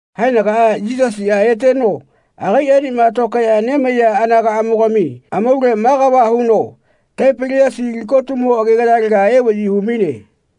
Haenagaꞌa Yisasiꞌa eteno agaiꞌenema tokaeꞌya nemaiya anagaꞌamogami amaule ma kava huno Taipiliasi tikotumo agegayalega evaꞌyi hu-maine.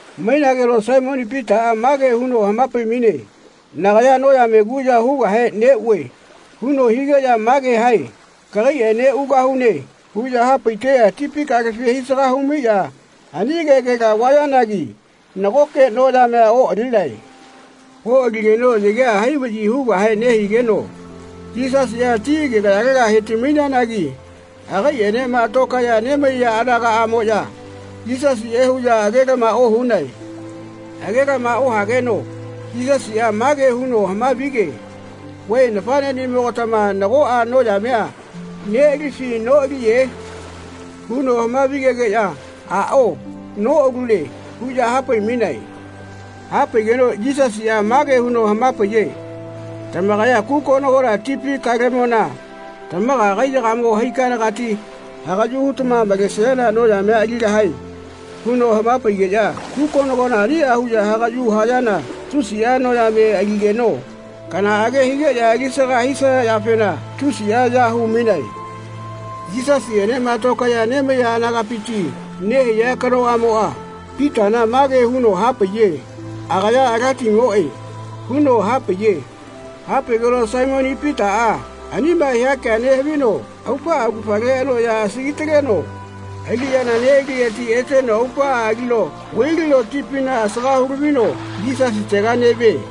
Mainageno Saimoni Pitaꞌa mage huno hama-pai-maine “Nagaya noyame kuꞌya hugahe neꞌue.” huno higeꞌya mage hae “Kagaiꞌene ugahune.” huꞌya hapaiteꞌya tipi kalefi hai-saga humaiꞌya ani kegela vayanagi nagoke noyamea oꞌalinae. Oꞌaligeno yagea hai vaꞌyi hugahe nehigeno Yisasiꞌa ti agegayalega he-ti-maiyanagi agaiꞌenema tokaeꞌya nemaiya anagaꞌamoꞌya Yisasiꞌe huꞌya agelama ohunae. Agelama ohageno Yisasiꞌa mage huno hama-vige “Vae nafaꞌneꞌnimogatama nagoꞌa noyamea neꞌalifi noꞌaliye?” huno hamavi-gegeꞌya “Aꞌao noꞌalune.” huꞌya hapai-mainae. Hapaigeno Yisasiꞌa mage huno hama-paiye “Tamakaya kukonagona tipi kalemona tamaga kaiyagamo haikanagati hagaꞌyu hutama malesayana noyamea aligahae.” huno hama-paigeꞌya kukonagona aniꞌa huꞌya hagaꞌyu hayana tusiꞌa noyame aligeno kanaꞌage higeꞌya alisaga hisaya yafena tusiꞌa ya hu-mainae. Yisasiꞌenema tokaeꞌya nemaiya anagapiti nehaiya kanoꞌamoꞌa Pitana mage huno hapaiye “Agaya Alatimoꞌe.” huno hapaiye. Hapaigeno Saimoni Pitaꞌa anima hia kea nehavino aupaꞌa augafale anoꞌya asagi-taleno aliꞌyana neꞌalileti eteno aupaꞌa alino vai-lino tipina asaga hu-lavino Yisasitega neꞌvie.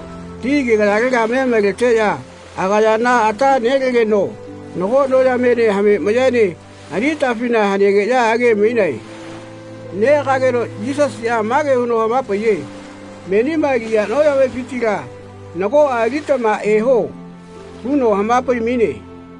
Ti agegayalega me maleteꞌya agayana ata nelegeno nago noyamene hame mayaene ani atafina hanegeꞌya age-mainae. Neꞌagageno Yisasiꞌa mage huno hama-paiye “Menima aliya noyamefitila nagoꞌa alitama eho.” huno hama-pai-maine.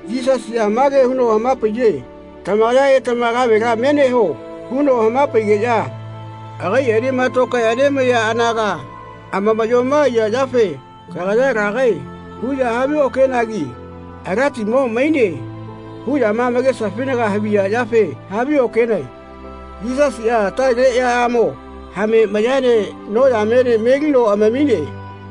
Yisasiꞌa mage huno hama-paiye “Tamakaya etama kavela me neho.” huno hama-paigeꞌya agaiꞌenema tokaeꞌya nemaiya anaga amamaꞌyoma aiya yafe “Kagaya lagae.” huꞌya haviokenagi “Alatimo maine.” huꞌyama amakesafinaga haviya yafe haviokenae. Yisasiꞌa atale eaꞌyamo hame mayaene noyamene melino amamine.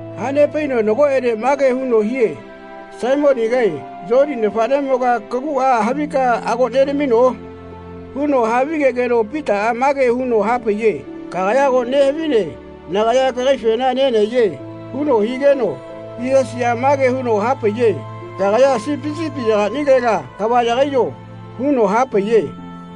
Hanepaino nagoꞌene mage huno hie “Saimonigae Yoni nafaꞌnemoga kaguꞌa havika ago nenamino?” huno havigegeno Pitaꞌa mage huno hapaiye “Kagaya ago nehavine nagaya kagaifena nenahaiye.” huno higeno Yisasiꞌa mage huno hapaiye “Kagaya sipi sipiyagaꞌnilela kava yagaiyo.” huno hapaiye.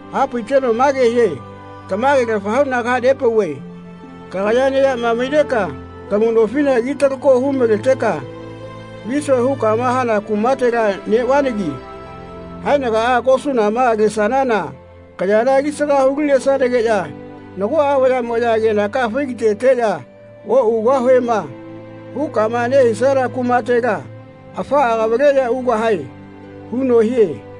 Hapaiteno mage hie “Tamage-lafa huꞌna kaha-pauve kagaya neyama maineka kamu nofila ki-takalo hu-maleteka ‘Visue.’ hukama hana kumatela neꞌvananagi haenagaꞌa kosunama lesanana kayana alisaga hu-linesanageꞌya nagoꞌa vayaꞌmoꞌya kenaka fai-ga-teteꞌya ‘Oꞌugahuema.’ hukama nehisana kumatela afaꞌa kavaleꞌya ugahae.” huno hie.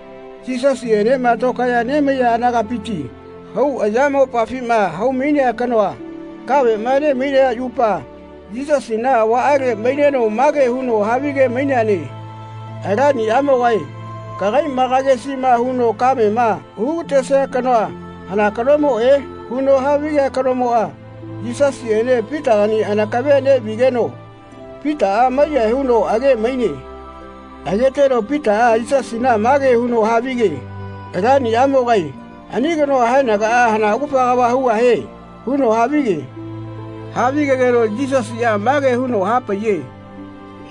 Yisasiꞌene tokaeꞌya nemaiya anagapiti hau ayamopafima hau-mainea kanoa kaveꞌma ne-mainaya yupa Yisasina avaꞌale maineno mage huno havige-maineane “Alaniꞌamogae kagaila kagesiꞌma huno kamema hu-ga-tesia kanoa hana kanomoꞌe?” huno havigea kanomoꞌa Yisasiꞌene Pitagani anakave neꞌvigeno Pitaꞌa maiyahae huno age-maine. Ageteno Pitaꞌa Yisasina mage huno havige “Alaniꞌamogae ani kanoa haenagaꞌa hana augafa kava hugahie?” huno havige. Havigegeno Yisasiꞌa mage huno hapaiye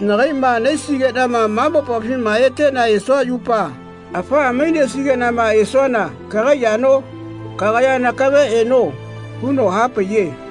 “Nakaiꞌma nahaisigeꞌnama ma mopafima eteꞌna esua yupa afaꞌa mainesigeꞌnama esuana kagai yano? Kagaya nakave eno.” huno hapaiye.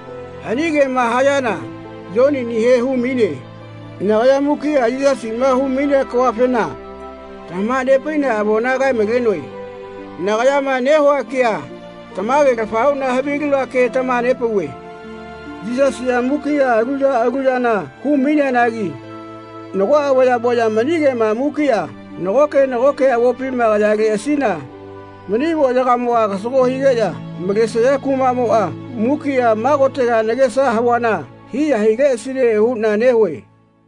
Ani kema hayana Yoninihe hu-maine. Nagaya mukiꞌa Yisasiꞌma hu-mainea kavafena tamaha-nepaiꞌna avona kae-malenoe. Nagayama nehua kea tamage-lafa huꞌna havilinoa ke tamaha-nepauve. Yisasiꞌa mukiꞌa alu ya alu yana hu-maineanagi nagoꞌa vayaꞌmoꞌya mani kema mukiꞌa nagoke nagoke avopima kayaleꞌasina mani avoꞌyagamoꞌa kasago higeꞌya malesaya kumaꞌmoꞌa mukiꞌa ma kotega nagesa havuana hiya hileꞌasine huꞌna nehue.